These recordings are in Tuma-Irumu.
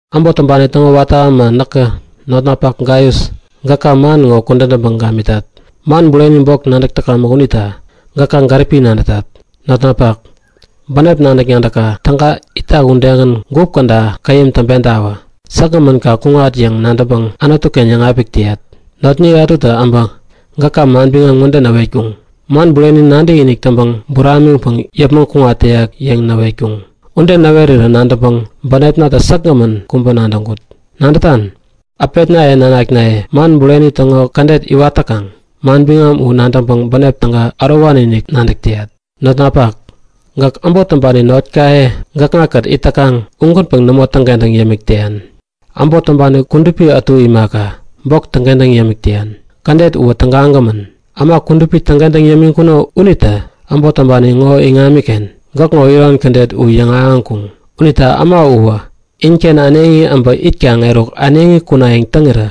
Äbot täŋpani täŋo watä äma näkä notnapak Gaius gäka man ŋo kudän täŋpäŋ gamitat. Man bureni bok nadäk täkamäk unita gäka gäripi-inik nadätat. Notnapak, bänep nadäk-nadäkka täga itak udegän gup käda käyäm täŋpentawä. Säkgämän kaŋ kuŋat yäŋ nadäŋpäŋ Anutu-ken yäŋapik täyat. Notniye ätutä äbä gäka manbiŋam ŋode näwetkuŋ; Man bureni nadäkinik täŋpäŋ buramiŋpäŋ yäpmäŋ kuŋat täyak yäŋ näwetkuŋ. Ude näwerä nadäŋpäŋ bänepnatä säkgämän kubä nadäŋkut. Nadätan? Äpetnaye nanaknaye man bureni täŋo kädet iwat täkaŋ, manbiŋam u nadäŋpäŋ bänep täga ärowani-inik nadäk täyat. Notnapak, gäk äbot täŋpani notkaye gäkŋa-kät it täkaŋ ugänpäŋ nämo täŋkentäŋ yämik täyan, äbot täŋpani kudupi ätu imaka, bok täŋkentäŋ yämik täyan. Kädet uwä tägagämän! Äma kudupi täŋkentäŋ yämiŋkuno unitä äbot täŋpani ŋo iŋamiken gäkŋo iron kädet u yäŋahäŋkuŋ. Unita äma uwä inken äneŋi äbä itkaŋ eruk äneŋi kunayäŋ täŋirä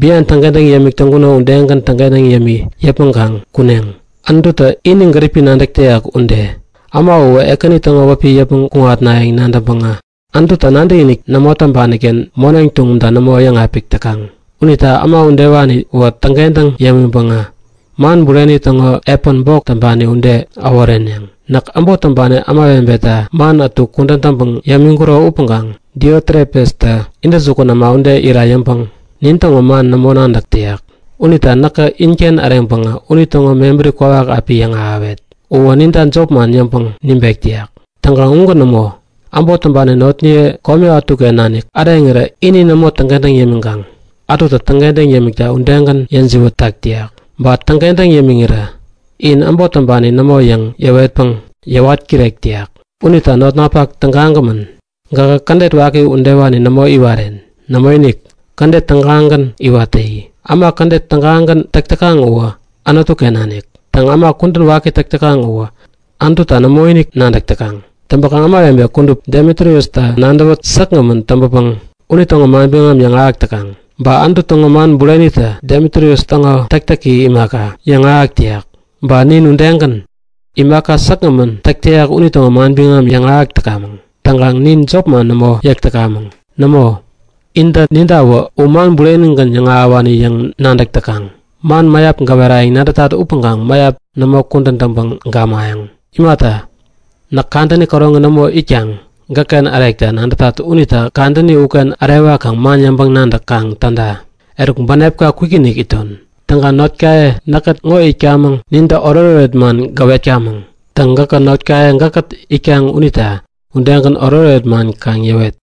bian täŋkentäŋ yämik täŋkuno udegän täŋkentäŋ yämi yäpmäŋkaŋ kuneŋ, Anututä ini gäripi nadäk täyak ude. Äma uwä Ekäni täŋo wäpi yäpmäŋ kuŋatnayäŋ nadäŋpäŋä Anututa nadäkinik nämo täŋpani-ken moneŋ tuŋumta nämo yäŋapik täkaŋ. Unita äma udewaniwä täŋkentäŋ yämiŋpäŋä man bureni täŋo epän bok täŋpani ude äworeneŋ. Näk äbot täŋpani ämawebeta man ätu kudän täŋpäŋ yämiŋkuro upäŋkaŋ Diotrepestä intäjukun äma ude ira yäŋpäŋ nin täŋo man nämo nadäk täyak. Unita näkä inken äreŋpäŋä unitäŋo mebäri kwawak api yäŋahäwet. Uwä ninta jopman yäŋpäŋ nibek täyak. Täŋkaŋ ugän nämo. Äbot täŋpani notniye kome ätuken nanik äreŋirä ini nämo täŋkentäŋ yämiŋkaŋ ätutä täŋkentäŋ yämikta udegän yäjiwät tak täyak. Ba täŋkentäŋ yämiŋirä in äbot täŋpani nämo yäŋ yäwetpäŋ yäwat kirek täyak. Unita notnapak tägagämän, gähä kädet waki udewani nämo iwaren. Nämoinik! Kädet tägagän iwat täyi. Äma kädet tägagän täk täkaŋ uwä Anutu-ken nanik. Täŋ, äma kudän waki täk täkaŋ uwä Anututa nämoinik nadäk täkaŋ. Täŋpäkaŋ ämawebe kudup Demitriusta nadäwä säkgämän täŋpäpäŋ unitäŋo manbiŋam yäŋahäk täkaŋ. Ba Anutu täŋo man burenitä Demitrius täŋo täktäki imaka, yäŋahäk täyak. Ba nin udegän, imaka säkgämän täk täyak unitäŋo manbiŋam yäŋahäk täkamäŋ. Täŋkaŋ nin jopman nämo yäk täkamäŋ. Nämo, intä nintawä u man burenigän yäŋahäwani yäŋ nadäk täkaŋ. Man mäyap gäwerayäŋ nadätat upäŋkaŋ mäyap nämo kudän täŋpäŋ gamayäŋ. Imata, näk kadäni käroŋi nämo itkaŋ gäkken ärekta nadätat unita kadäni uken ärewakaŋ man yäŋpäŋ-nadäk kaŋ täda. Eruk, bänepka kwikinik iton. Täŋkaŋ notkaye näkkät ŋo itkamäŋ nintä oretoret man gäwetkamäŋ. Täŋ, gäkä notnaye gäkkät itkaŋ unita udegän oretoret man kaŋ yäwet.